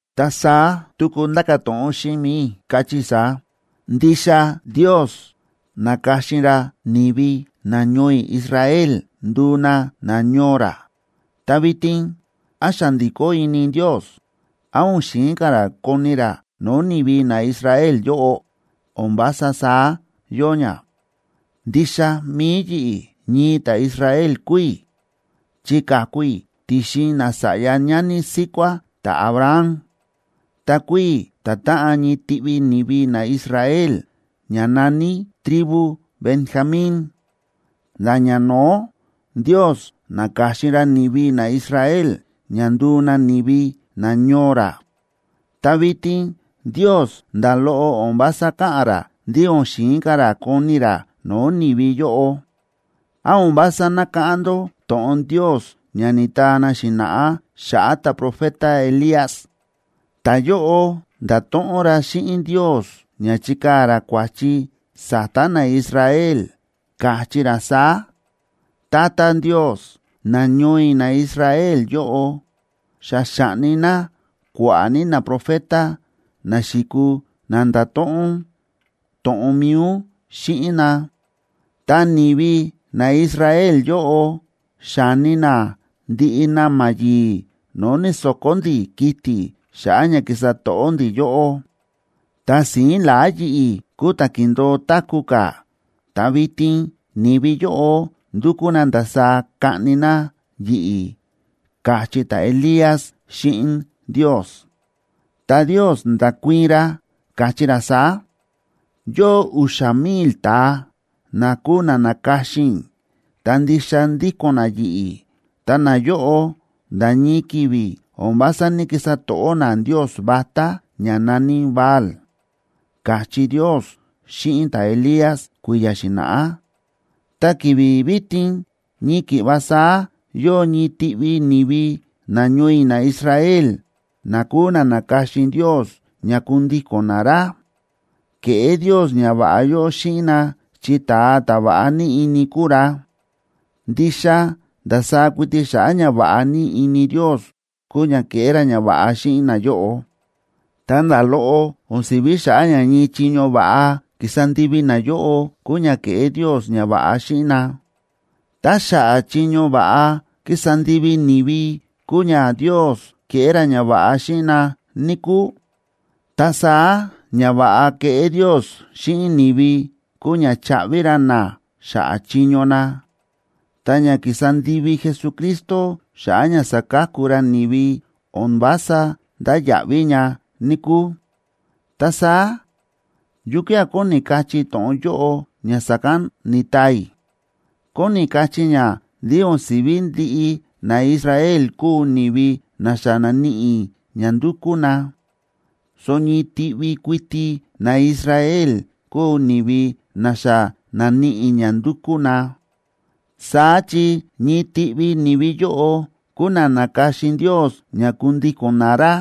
Ta saá tuku ndáka̱ to̱ꞌon xíꞌin mi̱i i̱, káchí i̱ saá: Ndixa Ndios na̱ka̱xin ra ni̱vi nañoo i̱ Israel nduu na nañoo ra, ta vitin, ¿án xa ndi̱kó ini Ndios? ¿Án o̱n xi̱in ka̱ ra koni ra no̱o̱ ni̱vi naIsrael yóꞌo? ¡O̱n vása saá yóo ña! Ndixa mi̱i yi̱ꞌi̱, ñii ta̱Israel kúu i̱, chi ka̱ku i̱ ti̱xin nasa̱ꞌya ñani síkuá ta̱Abraham. Ta kúu i̱ ta̱táꞌan ñii tiꞌvi ni̱vi naIsrael, ña na̱ní tribu Benjamín. Nda̱ ñano̱ó, Ndios na̱ka̱xin ra ni̱vi naIsrael ña nduu na ni̱vi nañoo ra, ta vitin Ndios nda̱ loꞌo o̱n vása káꞌa̱n ra ndí o̱n xi̱in ka̱ ra koni ra no̱o̱ ni̱vi yóꞌo. ¿Án o̱n vása nákáꞌán ndó to̱ꞌon Ndios ña ni̱taa na xi̱na̱ꞌá xa̱ꞌa̱ ta̱profeta Elías? Ta̱yóꞌo nda̱to̱ꞌon ra xíꞌin Ndios ña chíkaa̱ ra kua̱chi sa̱ta̱ naIsrael, káchí ra saá: “Tata Ndios, nañoo i̱ naIsrael yóꞌo xa xa̱ꞌni na kua̱ꞌa̱ ní naprofeta, na xi̱kuu na nda̱to̱ꞌon to̱ꞌon mi̱i ún xíꞌin na, ta ni̱vi naIsrael yóꞌo xa̱ni na ndiꞌi na̱ma̱ yi̱i̱ no̱o̱ ni̱so̱ko̱ ndi̱ kiti̱ xa̱ꞌa̱ ña kísa to̱ꞌó ndi̱ yóꞌó. Ta si̱ín la̱á yi̱ꞌi̱ kúu ta̱ kíndo̱o táku̱ ka̱, ta vitin ni̱vi yóꞌo ndúkú na ndasaá kaꞌni na yi̱ꞌi̱”, káchí ta̱Elías xíꞌin Ndios. Ta Ndios nda̱kuii̱n ra, káchí ra saá: “Yóo u̱xa̱ mil ta̱a na kúu na na̱ka̱xin i̱, ta ndixa ndíko̱n na yi̱ꞌi̱, ta nayóꞌo nda̱ ñii ki̱vi̱ o̱n vása ní‑kisa to̱ꞌó na ndios vatá ña na̱ní Baal”, káchí Ndios xíꞌin ta̱Elías kui̱ya̱ xi̱na̱ꞌá. Ta ki̱vi̱ vitin ñii ki̱ꞌva saá yóo ñii tiꞌvi ni̱vi nañoo i̱ naIsrael na kúu na na̱ka̱xin Ndios ña kundíko̱n na ra. Ke̱ꞌé Ndios ñava̱ꞌa yóꞌo xíꞌin na, chi ta̱a ta̱ va̱ꞌa ní ini kúu ra. Ndixa ndasaá kuiti xa̱ꞌa̱ ñava̱ꞌa ní ini Ndios kúu ña kéꞌé ra ñava̱ꞌa xíꞌin nayóꞌo, ta nda̱ loꞌo o̱n si̱ví xa̱ꞌa̱ ña ñii chiño va̱ꞌa ki̱sa ndivi nayóꞌo kúu ña kéꞌé Ndios ñava̱ꞌa xíꞌin na. Tá xa̱ꞌa̱ chiño va̱ꞌa ki̱sa ndivi ni̱vi kúu ña Ndios kéꞌé ra ñava̱ꞌa xíꞌin na, níkúu, ta saá ñava̱ꞌa kéꞌé Ndios xíꞌin ni̱vi kúu ña chaꞌvi ra na xa̱ꞌa̱ chiño na, ta ña ki̱sa ndivi Jesucristo xa̱ꞌa̱ ña sa̱ka̱ku ra ni̱vi o̱n vása ndáya̱ꞌví ña, níkúu. Ta saá, ¿yukía̱ kóni kachí to̱ꞌon yóꞌo ña sa̱kán ni̱taa i̱? Kóni kachí ña ndí o̱n si̱ví ndiꞌi naIsrael kúu ni̱vi na xa na̱níꞌi ña ndúkú na, so ñii tiꞌvi kuiti naIsrael kúu ni̱vi na xa na̱níꞌi ña ndúkú na. Saá chi ñii tiꞌvi ni̱vi yóꞌo kúu na na̱ka̱xin Ndios ña kundíko̱n na ra.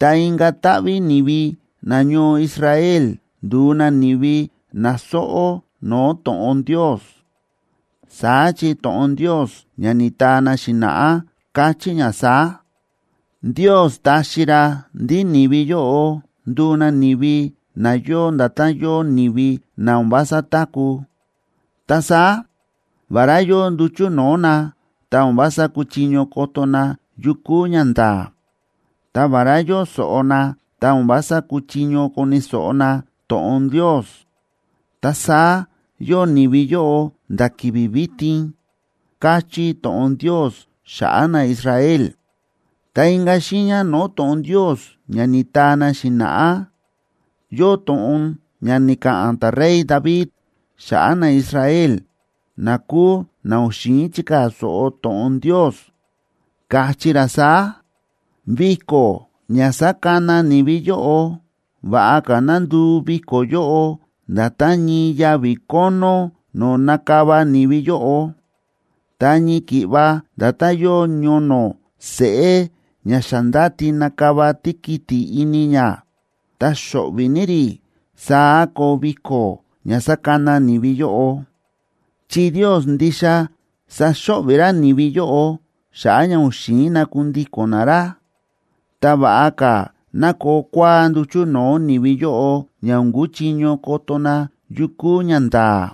Ta inka̱ táꞌví ni̱vi nañoo Israel ndu̱u na ni̱vi na sóꞌó no̱o̱ to̱ꞌon Ndios. Saá chi to̱ꞌon Ndios ña ni̱taa na xi̱na̱ꞌá káchí ña saá: “Ndios ta̱xi ra ndí ni̱vi yóꞌo ndu̱u na ni̱vi na yóo nda̱tán yóo ni̱vi na o̱n vása táku̱. Ta saá, vará yóo nduchu̱ no̱o̱ na, ta o̱n vása kúchiño koto na yu kúu ñanda̱a̱. Ta vará yóo so̱ꞌo na, ta o̱n vása kúchiño koni̱ so̱ꞌo na to̱ꞌon Ndios. Ta saá yóo ni̱vi yóꞌo nda̱ ki̱vi̱ vitin”, káchí to̱ꞌon Ndios xa̱ꞌa̱ naIsrael. Ta inka̱ xiiña no̱o̱ to̱ꞌon Ndios ña ni̱taa na xi̱na̱ꞌá, yóo to̱ꞌon ña ni̱ka̱ꞌa̱n ta̱rey David xa̱ꞌa̱ naIsrael na kúu na o̱n xi̱in chikaa̱ so̱ꞌo to̱ꞌon Ndios, káchí ra saá: Viko̱ ña sákana ni̱vi yóꞌo, va̱ꞌa ka̱ ná nduu viko̱ yóꞌo, nda̱tán ñii yavi̱ kónó no̱o̱ nakava ni̱vi yóꞌo. Ta ñii ki̱ꞌva nda̱tán yóo ñono̱ seꞌé ña xa ndáti nakava tíkiti̱ ini ña, ta xo̱ꞌvi̱ ní rí, saá koo viko̱ ña sakana ni̱vi yóꞌo. Chi Ndios ndixa saxo̱ꞌvi̱ ra ni̱vi yóꞌo xa̱ꞌa̱ ña o̱n xi̱in na kundíko̱n na ra. Ta va̱ꞌa ka̱ ná koo kua̱á nduchu̱ no̱o̱ ni̱vi yóꞌo, ña o̱n kuchiño koto na yu kúu ñanda̱a̱.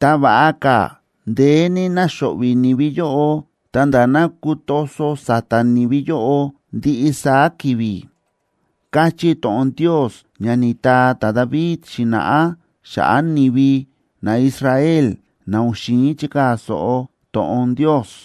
Ta va̱ꞌa ka̱ ndeé ní ná xo̱ꞌvi̱ ni̱vi yóꞌo, ta̱nda̱ ná kutoso sa̱ta̱ ni̱vi yóꞌo ndiꞌi saá ki̱vi̱, káchí to̱ꞌon Ndios ña ni̱taa ta̱David xi̱na̱ꞌá xa̱ꞌa̱ ni̱vi naIsrael, na o̱n xi̱in chikaa̱ so̱ꞌo to̱ꞌon Ndios.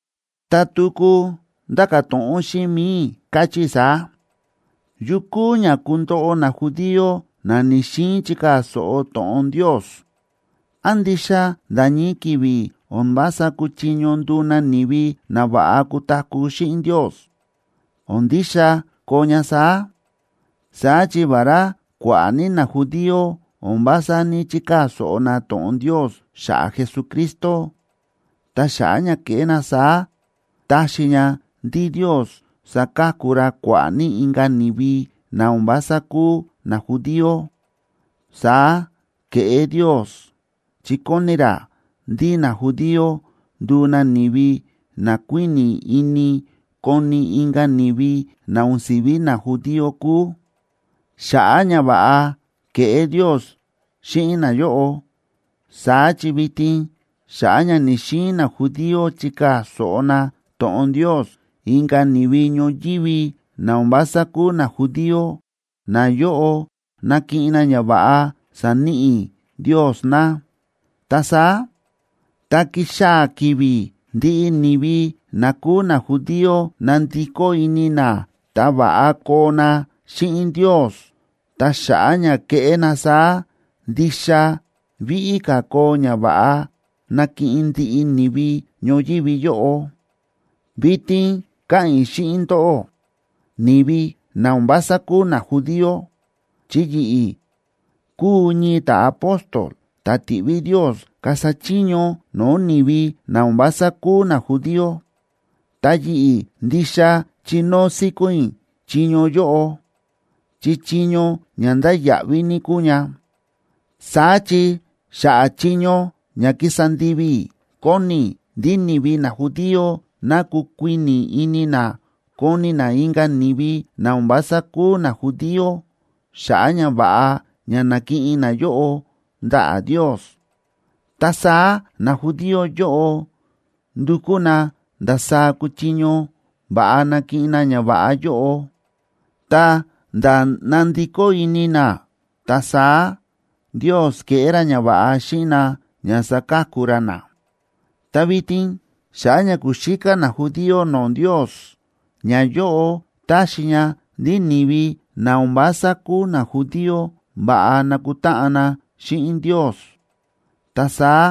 Ta tuku ndáka̱ to̱ꞌon xíꞌin mi̱i i̱, káchí i̱ saá: ¿Yu kúu ña kundoꞌo najudío, na ni̱‑xiin chikaa̱ so̱ꞌo to̱ꞌon Ndios? ¿Án ndixa nda̱ ñii ki̱vi̱ o̱n vása kuchiño nduu na ni̱vi na va̱ꞌa kutaku̱ xíꞌin Ndios? ¡O̱n ndixa koo ña saá! Saá chi vará kua̱ꞌa̱ ní najudío o̱n vása ní‑chikaa̱ so̱ꞌo na to̱ꞌon Ndios xa̱ꞌa̱ Jesucristo, ta xa̱ꞌa̱ ña ke̱ꞌé na saá ta̱xi ña ndí Ndios sa̱ka̱ku ra kua̱ꞌa̱ ní inka̱ ni̱vi na o̱n vása kúu najudío. Saá ke̱ꞌé Ndios, chi kóni ra ndí najudío nduu na ni̱vi na kuíni̱ ini koni inka̱ ni̱vi na o̱n si̱vi najudío kúu, xa̱ꞌa̱ ñava̱ꞌa ke̱ꞌé Ndios xíꞌin nayóꞌo. Saá chi vitin xa̱ꞌa̱ ña ni̱‑xiin najudío chikaa̱ so̱ꞌo na to̱ꞌon Ndios, inka̱ ni̱vi ñoyívi na o̱n vása kúu najudío, nayóꞌo nakiꞌin na ñava̱ꞌa saníꞌi Ndios na. Ta saá, tá kixaa̱ ki̱vi̱ ndiꞌi ni̱vi na kúu najudío nandikó ini na ta va̱ꞌa koo na xíꞌin Ndios, ta xa̱ꞌa̱ ña keꞌé na saá, ¡ndixa víꞌí ka̱ koo ñava̱ꞌa nakiꞌin ndiꞌi ni̱vi ñoyívi yóꞌo! Vitin káꞌa̱n i̱ xíꞌin ndóꞌó, ni̱vi na o̱n vása kúu najudío, chi yi̱ꞌi̱ kúu ñii ta̱apóstol ta̱ ti̱ꞌví Ndios kasa chiño no̱o̱ ni̱vi na o̱n vása kúu najudío. Ta yi̱ꞌi̱ ndixa chínóo síkón i̱ chiño yóꞌo, chi chiño ña ndáya̱ꞌví ní kúu ña. Saá chi, xa̱ꞌa̱ chiño ña kísa ndivi i̱, kóni i̱ ndí ni̱vi najudío ná kukuíni̱ ini na koni na inka̱ ni̱vi na o̱n vása kúu najudío xa̱ꞌa̱ ñava̱ꞌa ña na̱kiꞌin nayóꞌo ndaꞌa̱ Ndios. Ta saá najudío yóꞌo ndukú na ndasaá kuchiño va̱ꞌa nakiꞌin na ñava̱ꞌa yóꞌo, ta̱nda̱ nandikó ini na, ta saá Ndios keꞌé ra ñava̱ꞌa xíꞌin na ña saka̱ku ra na. Ta vitin xa̱ꞌa̱ ña ku̱xíká najudío no̱o̱ Ndios, ñayóꞌo táxi ña ndí ni̱vi na o̱n vása kúu najudío va̱ꞌa nakutáꞌan na xíꞌin Ndios. Ta saá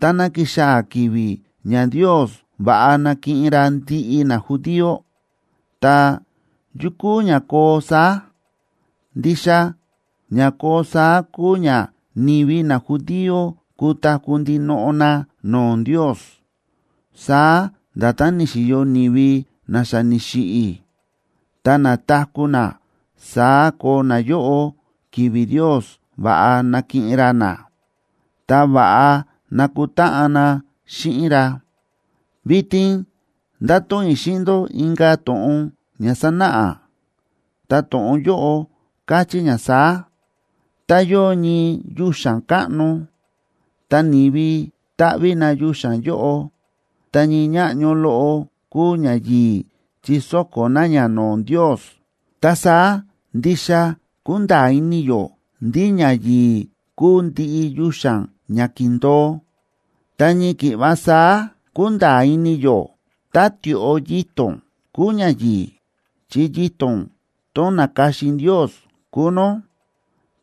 táná kixaa̱ ki̱vi̱ ña Ndios va̱ꞌa nakiꞌin ra ndiꞌi najudío, ta, ¿yu kúu ña koo saá? Ndixa ña koo saá kúu ña ni̱vi najudío kutaku̱ ndinoꞌo na no̱o̱ Ndios. Saá nda̱tán ni̱xi̱yo ni̱vi na xa ni̱xiꞌi̱, ta na̱taku̱ na, saá koo nayóꞌo ki̱vi̱ Ndios va̱ꞌa nakiꞌin ra na, ta va̱ꞌa nakutáꞌan na xíꞌin ra. Vitin ndato̱ꞌon i̱ xíꞌin ndó inka̱ to̱ꞌon ña sánáꞌa, ta to̱ꞌon yóꞌo káchí ña saá: Tá yóo ñii yuxa̱n káꞌno, ta ni̱vi táꞌví na yuxa̱n yóꞌo, ta ñii ñáꞌño loꞌo kúu ñayi̱i̱ chi sóko̱ na ña no̱o̱ Ndios, ta saá ndixa kúnda̱a̱ ini yó ndí ñayi̱i̱ kúu ndiꞌi yuxa̱n ña kíndo̱o. Ta ñii ki̱ꞌva saá kúnda̱a̱ ini yó tá tioꞌo yito̱n kúu ñayi̱i̱, chi yito̱n tón na̱ka̱xin Ndios kúu nó,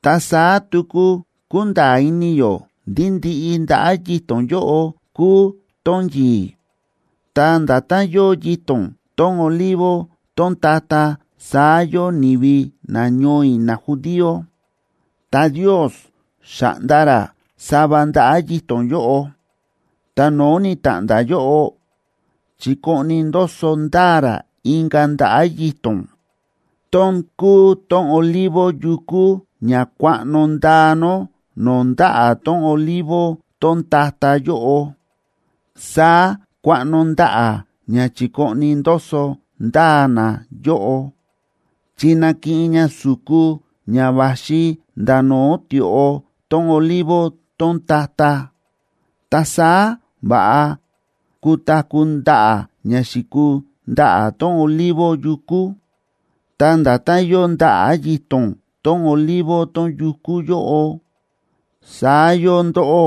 ta saá tuku kúnda̱a̱ ini yó ndí ndiꞌi ndaꞌa̱ yito̱n yóꞌo kúu tón yi̱i̱. Ta nda̱tán yóo yito̱n tón olivo tón ta̱ta̱, saá yóo ni̱vi nañoo i̱ najudío. Ta Ndios xa̱ꞌnda ra sava ndaꞌa̱ yito̱n yóꞌo, ta no̱o̱ ni̱ta̱ꞌnda̱ yóꞌo, chi̱koꞌni ndoso ndaa ra inka̱ ndaꞌa̱ yito̱n, tón kúu tón olivo yukú ña kuaꞌno ndaa nó no̱o̱ ndaꞌa̱ tón olivo tón ta̱ta̱ yóꞌo. Saá kuaꞌno ndaꞌa̱ ña chi̱koꞌni ndoso ndaa na yóꞌo, chi nakiꞌin ña su̱ku ña va̱xi nda̱ no̱o̱ tioꞌo tón olivo tón ta̱ta̱, ta saá va̱ꞌa kutaku̱ ndaꞌa̱ ña xi̱kuu ndaꞌa̱ tón olivo yukú. Ta nda̱tán yóo ndaꞌa̱ yito̱n tón olivo tón yukú yóꞌo, saá yóo ndóꞌó,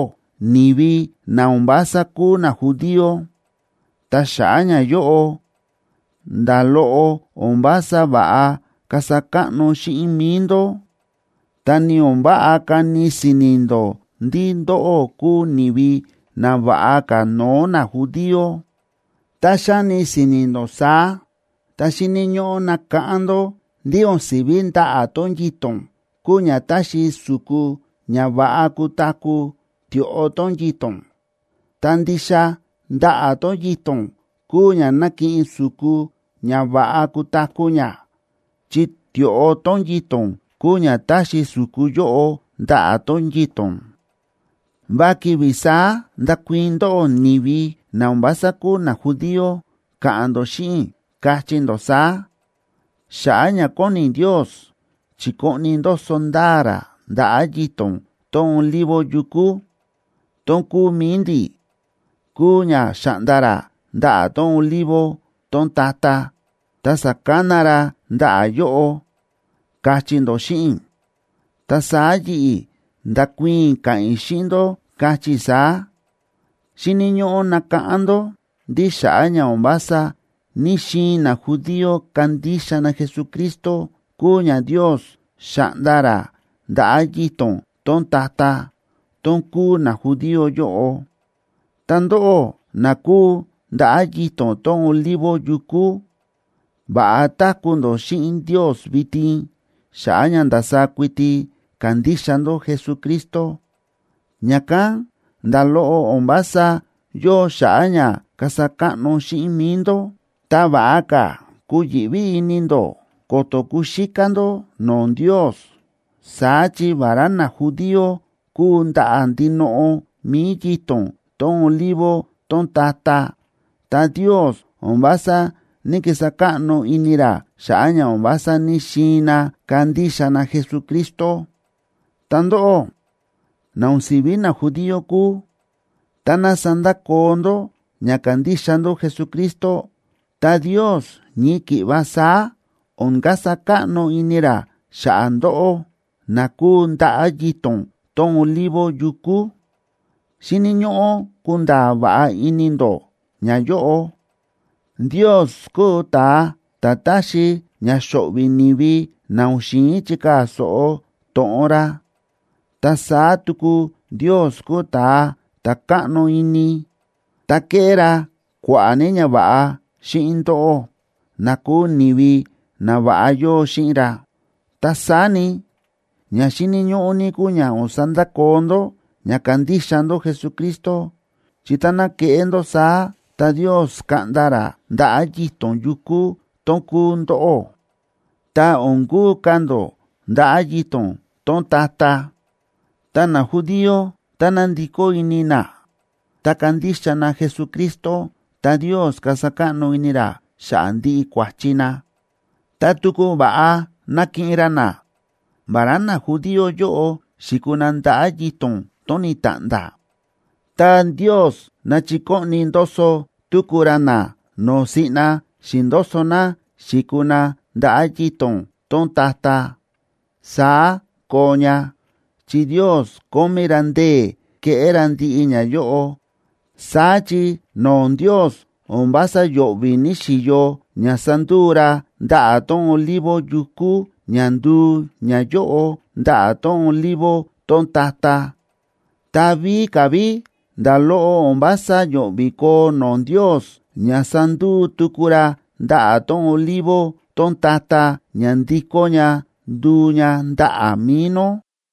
ni̱vi na o̱n vása kúu najudío. Ta xa̱ꞌa̱ ñayóꞌo, nda̱ loꞌo o̱n vása va̱ꞌa kasa káꞌno xíꞌin mi̱i ndó, ta ni o̱n váꞌa kani si̱ni̱ ndó ndí ndóꞌó kúu ni̱vi nava̱ꞌa ka̱ no̱o̱ najudío. Tá xáni si̱ni̱ ndó saá, ta xíni̱ ñóꞌó nakáꞌán ndó ndí o̱n si̱ví ndaꞌa̱ tón yito̱n kúu ña táxi su̱ku ña va̱ꞌa kutaku̱ tioꞌo tón yito̱n, ta ndixa ndaꞌa̱ tón yito̱n kúu ña nákiꞌin su̱ku ña va̱ꞌa kutaku̱ ña, chi tioꞌo tón yito̱n kúu ña táxi su̱ku yóꞌo ndaꞌa̱ tón yito̱n. Va ki̱vi̱ saá ndakuii̱n ndóꞌó ni̱vi na o̱n vása kúu najudío, ka̱ꞌa̱n ndó xíꞌin i̱, kachí ndó saá: “Xa̱ꞌa̱ ña kóni Ndios chikoꞌni ndoso ndaa ra ndaꞌa̱ yito̱n tón olivo yukú, tón kúu mi̱i ndi̱, kúu ña xa̱ꞌnda ra ndaꞌa̱ tón olivo tón ta̱ta̱ ta sa̱kana ra ndaꞌa̱ yóꞌo”, kachí ndó xíꞌin i̱. Ta saá yi̱ꞌi̱, ndakuii̱n i̱ ka̱ꞌa̱n i̱ xíꞌin ndó, kachí i̱ saá: Xíni̱ ñóꞌó nakáꞌán ndó ndí xa̱ꞌa̱ ña o̱n vása ní‑xiin najudío kandixa na Jesucristo kúu ña Ndios xa̱ꞌnda ra ndaꞌa̱ yito̱n tón ta̱ta̱, tón kúu najudío yóꞌo. Ta ndóꞌó, na kúu ndaꞌa̱ yito̱n tón olivo yukú, va̱ꞌa táku̱ ndó xíꞌin Ndios vitin xa̱ꞌa̱ ña ndasaá kuiti kándixa ndó Jesucristo. Ña̱kán nda̱ loꞌo o̱n vása yóo xa̱ꞌa̱ ña kasa káꞌno xíꞌin mi̱i ndó, ta va̱ꞌa ka̱ kuyi̱ꞌví ini ndó ko̱to̱ kuxíká ndó no̱o̱ Ndios. Saá chi vará najudío kúu ndaꞌa̱ ndinoꞌo mi̱i yito̱n tón olivo tón ta̱ta̱, ta Ndios o̱n vása ní‑kisa káꞌno ini ra xa̱ꞌa̱ ña o̱n vása ní‑xiin na kandixa na Jesucristo. Ta ndóꞌó, na o̱n si̱ví najudío kúu, táná sandakoo ndó ña kándixa ndó Jesucristo, ta Ndios ñii ki̱ꞌva saá o̱n kasa káꞌno ini ra xa̱ꞌa̱ ndóꞌó, na kúu ndaꞌa̱ yito̱n tón olivo yukú. Xíni̱ ñóꞌó kunda̱a̱ va̱ꞌa ini ndó ñayóꞌo: Ndios kúu ta̱a ta̱ táxi ña xo̱ꞌvi̱ ni̱vi na o̱n xi̱in chikaa̱ so̱ꞌo to̱ꞌon ra, ta saá tuku Ndios kúu ta̱a ta̱ káꞌno ini, ta kéꞌé ra kua̱ꞌa̱ ní ñava̱ꞌa xíꞌin ndóꞌó, na kúu ni̱vi na va̱ꞌa yóo xíꞌin ra. Ta saá ni, ña xíni̱ ñóꞌó ní kúu ña o̱n sandakoo ndó ña kándixa ndó Jesucristo, chi táná keꞌé ndó saá, ta Ndios kaꞌnda ra ndaꞌa̱ yito̱n yukú tón kúu ndóꞌó, ta o̱n kuu ka̱ ndó ndaꞌa̱ yito̱n tón ta̱ta̱. Ta najudío, táná ndikó ini na ta kandixa na Jesucristo, ta Ndios kasa káꞌno ini ra xa̱ꞌa̱ ndiꞌi kua̱chi na, ta tuku va̱ꞌa nakiꞌin ra na. Vará najudío yóꞌo xi̱kuu na ndaꞌa̱ yito̱n tón ni̱ta̱ꞌnda̱, ta Ndios nachikoꞌni ndoso tuku ra na no̱o̱ siꞌna xi̱ndoso na xi̱kuu na ndaꞌa̱ yito̱n tón ta̱ta̱. Saá koo ña, chi Ndios kómí ra ndee̱ keꞌé ra ndiꞌi ñayóꞌo. Saá chi no̱o̱ Ndios o̱n vása yo̱ꞌvi̱ ni̱xi̱yo ña sa̱nduu ra ndaꞌa̱ tón olivo yukú ña nduu ñayóꞌo ndaꞌa̱ tón olivo tón ta̱ta̱. Ta víka̱ ví nda̱ loꞌo o̱n vása yo̱ꞌvi̱ koo no̱o̱ Ndios ña sanduu tuku ra ndaꞌa̱ tón olivo tón ta̱ta̱ ña ndikó ña nduu ña ndaꞌa̱ mi̱i nó.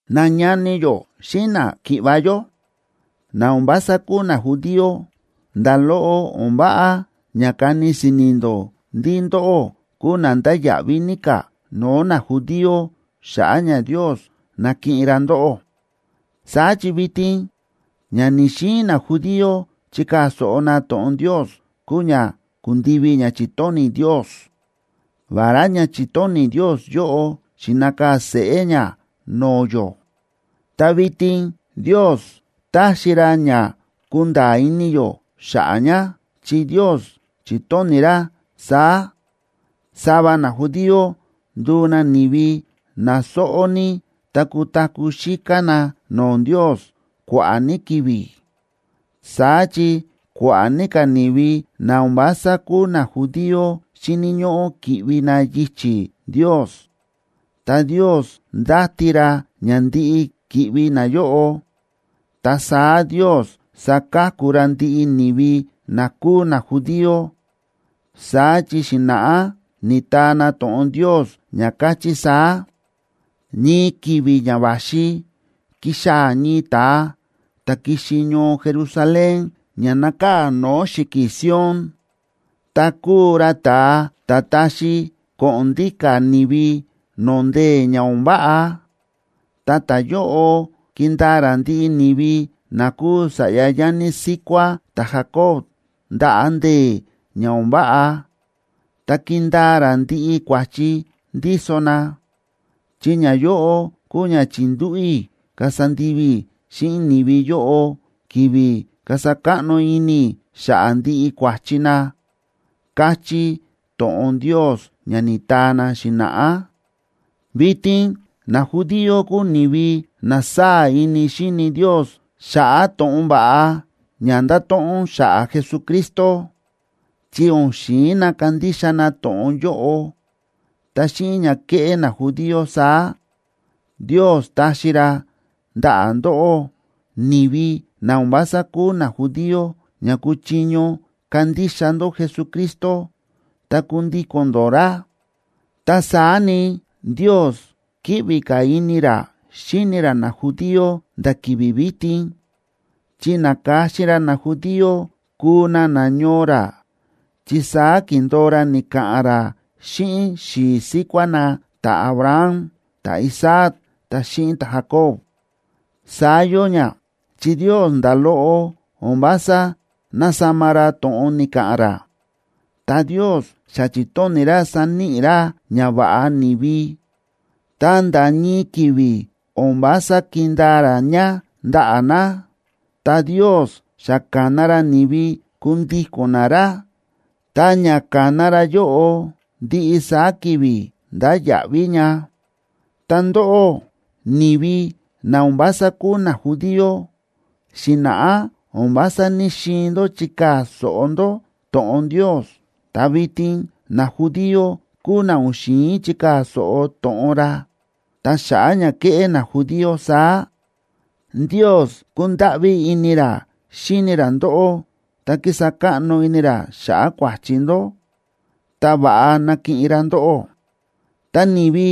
Nañani yó xíꞌin náki̱ꞌva̱ yó, na o̱n vása kúu najudío, nda̱ loꞌo o̱n váꞌa ña kani si̱ni̱ ndó ndí ndóꞌó kúu na ndáya̱ꞌví ní ka̱ no̱o̱ najudío xa̱ꞌa̱ ña Ndios na̱kiꞌin ra ndóꞌó. Saá chi vitin ña ni̱‑xiin najudío chikaa̱ so̱ꞌo na to̱ꞌon Ndios kúu ña kundivi ña chi̱tóni̱ Ndios. Vará ña chi̱tóni̱ Ndios yóꞌo xi̱nakaa̱ seꞌé ña no̱o̱ yó, ta vitin Ndios táxi ra ña kúnda̱a̱ ini yó xa̱ꞌa̱ ña. Chi Ndios chi̱tóni̱ ra saá: Sava najudío nduu na ni̱vi na sóꞌó ní ta kutaku̱ xíká na no̱o̱ Ndios kua̱ꞌa̱ ní ki̱vi̱. Saá chi kua̱ꞌa̱ ní ka̱ ni̱vi na o̱n vása kúu najudío xíni̱ ñóꞌó ki̱ꞌvi na yichi̱ Ndios, ta Ndios ndáti ra ña ndiꞌi ki̱ꞌvi nayóꞌo, ta saá Ndios saka̱ku ra ndiꞌi ni̱vi na kúu najudío. Saá chi xi̱na̱ꞌá ni̱taa na to̱ꞌon Ndios ña káchí saá: Ñii ki̱vi̱ ña va̱xi, kixaa̱ ñii ta̱a ta̱ kixi ñoo Jerusalén ña nákaa̱ no̱o̱ xi̱ki̱ Sion, ta kuu ra ta̱a ta̱ taxi ko̱ꞌo̱n ndíka̱ ni̱vi no̱o̱ ndee̱ ña o̱n váꞌa. Ta ta̱yóꞌo kindaa ra ndiꞌi ni̱vi na kúu sa̱ꞌya ñani síkuá ta̱Jacob ndaꞌa̱ ndee̱ ña o̱n váꞌa, ta kindaa ra ndiꞌi kua̱chi ndíso na. Chi ñayóꞌo kúu ña chi̱ndúꞌu̱ i̱ kasa ndivi i̱ xíꞌin ni̱vi yóꞌo, ki̱vi̱ kasa káꞌno ini i̱ xa̱ꞌa̱ ndiꞌi kua̱chi na, káchí to̱ꞌon Ndios ña ni̱taa na xi̱na̱ꞌá. Vitin najudío kúu ni̱vi na sáa̱ ini xíni Ndios xa̱ꞌa̱ to̱ꞌon va̱ꞌa ña ndáto̱ꞌon xa̱ꞌa̱ Jesucristo, chi o̱n xi̱in na kandixa na to̱ꞌon yóꞌo. Ta xíꞌin ña kéꞌé najudío saá, Ndios ta̱xi ra ndaꞌa̱ ndóꞌó, ni̱vi na o̱n vása kúu najudío, ña kuchiño kandixa ndó Jesucristo ta kundíko̱n ndó ra. Ta saá ni, Ndios kíꞌvi ka̱ ini ra xíni ra najudío nda̱ ki̱vi̱ vitin, chi na̱ka̱xin ra najudío kuu na nañoo ra, chi saá ki̱ndo̱o ra ni̱ka̱ꞌa̱n ra xíꞌin xi̱i̱ síkuá na ta̱Abraham, ta̱Isaac ta xíꞌin ta̱Jacob. Saá yóo ña, chi Ndios nda̱ loꞌo o̱n vása násama ra to̱ꞌon ni̱ka̱ꞌa̱n ra. Tá Ndios xa chi̱tóni̱ ra saníꞌi ra ñava̱ꞌa ni̱vi, ta nda̱ ñii ki̱vi̱ o̱n vása kindaa ra ña ndaꞌa̱ na. Tá Ndios xa ka̱na ra ni̱vi kundíko̱n na ra, ta ña ka̱na ra yóꞌo ndiꞌi saá ki̱vi̱ ndáya̱ꞌví ña. Ta ndóꞌó ni̱vi na o̱n vása kúu najudío, xi̱na̱ꞌá o̱n vása ní‑xiin ndó chikaa̱ so̱ꞌo ndó to̱ꞌon Ndios, ta vitin najudío kúu na o̱n xi̱in chikaa̱ so̱ꞌo to̱ꞌon ra. Ta xa̱ꞌa̱ ña ke̱ꞌé najudío saá, Ndios ku̱ndáꞌví ini ra xíni ra ndóꞌó, ta ki̱sa káꞌno ini ra xa̱ꞌa̱ kua̱chi ndó, ta va̱ꞌa na̱kiꞌin ra ndóꞌó. Ta ni̱vi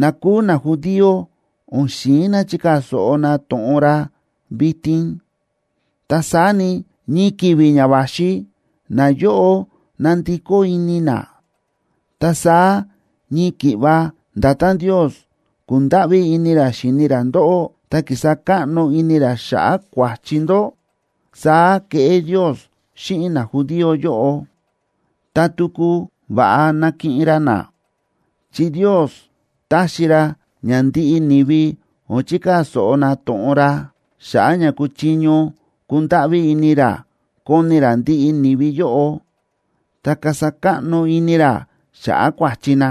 na kúu najudío o̱n xi̱in na chikaa̱ so̱ꞌo na to̱ꞌon ra vitin. Ta saá ni, ñii ki̱vi̱ ña va̱xi nayóꞌo nandikó ini na. Ta saá ñii ki̱ꞌva nda̱tán Ndios ku̱ndáꞌví ini ra xíni ra ndóꞌó, ta ki̱sa káꞌno ini ra xa̱ꞌa̱ kua̱chi ndó, saá keꞌé Ndios xíꞌin najudío yóꞌo, ta tuku va̱ꞌa nakiꞌin ra na. Chi Ndios ta̱xi ra ña ndiꞌi ni̱vi o̱n chikaa̱ so̱ꞌo na to̱ꞌon ra, xa̱ꞌa̱ ña kúchiño kundáꞌví ini ra koni ra ndiꞌi ni̱vi yóꞌo, ta kasa káꞌno ini ra xa̱ꞌa̱ kua̱chi na.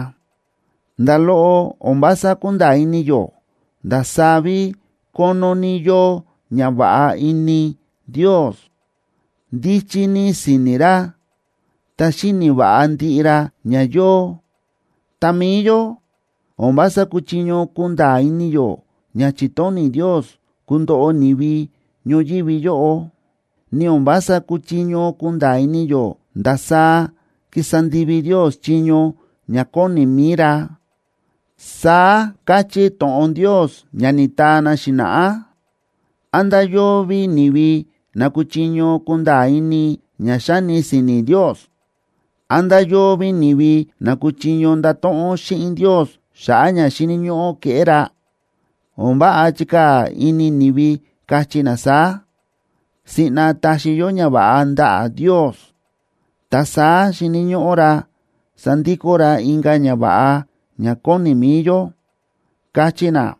¡Nda̱ loꞌo o̱n vása kúnda̱a̱ ini yó ndasaá ví kónó ní yóo ñava̱ꞌa ní ini Ndios! ¡Ndíchí ní si̱ni̱ ra, ta xíni̱ va̱ꞌa ndiꞌi ra ña yóo! Ta mi̱i yó, o̱n vása kúchiño kunda̱a̱ ini yó ña chi̱tóni̱ Ndios kundoꞌo ni̱vi ñoyívi yóꞌo, ni o̱n vása kúchiño kunda̱a̱ ini yó ndasaá kísa ndivi Ndios chiño ña kóni mi̱i ra. Saá káchí to̱ꞌon Ndios ña ni̱taa na xi̱na̱ꞌá: “¿Án nda̱ yóo ví ni̱vi na kúchiño kunda̱a̱ ini ña xáni si̱ni̱ Ndios? ¿Án nda̱ yóo ví ni̱vi na kúchiño ndato̱ꞌon xíꞌin Ndios xa̱ꞌa̱ ña xíni̱ ñóꞌó keꞌé ra?” O̱n váꞌa chikaa̱ ini ni̱vi, káchí na saá: “Siꞌna taxi yó ñava̱ꞌa ndaꞌa̱ Ndios, ta saá xíni̱ ñóꞌó ra sandikó ra inka̱ ñava̱ꞌa ña kóni mi̱i yó”, káchí na.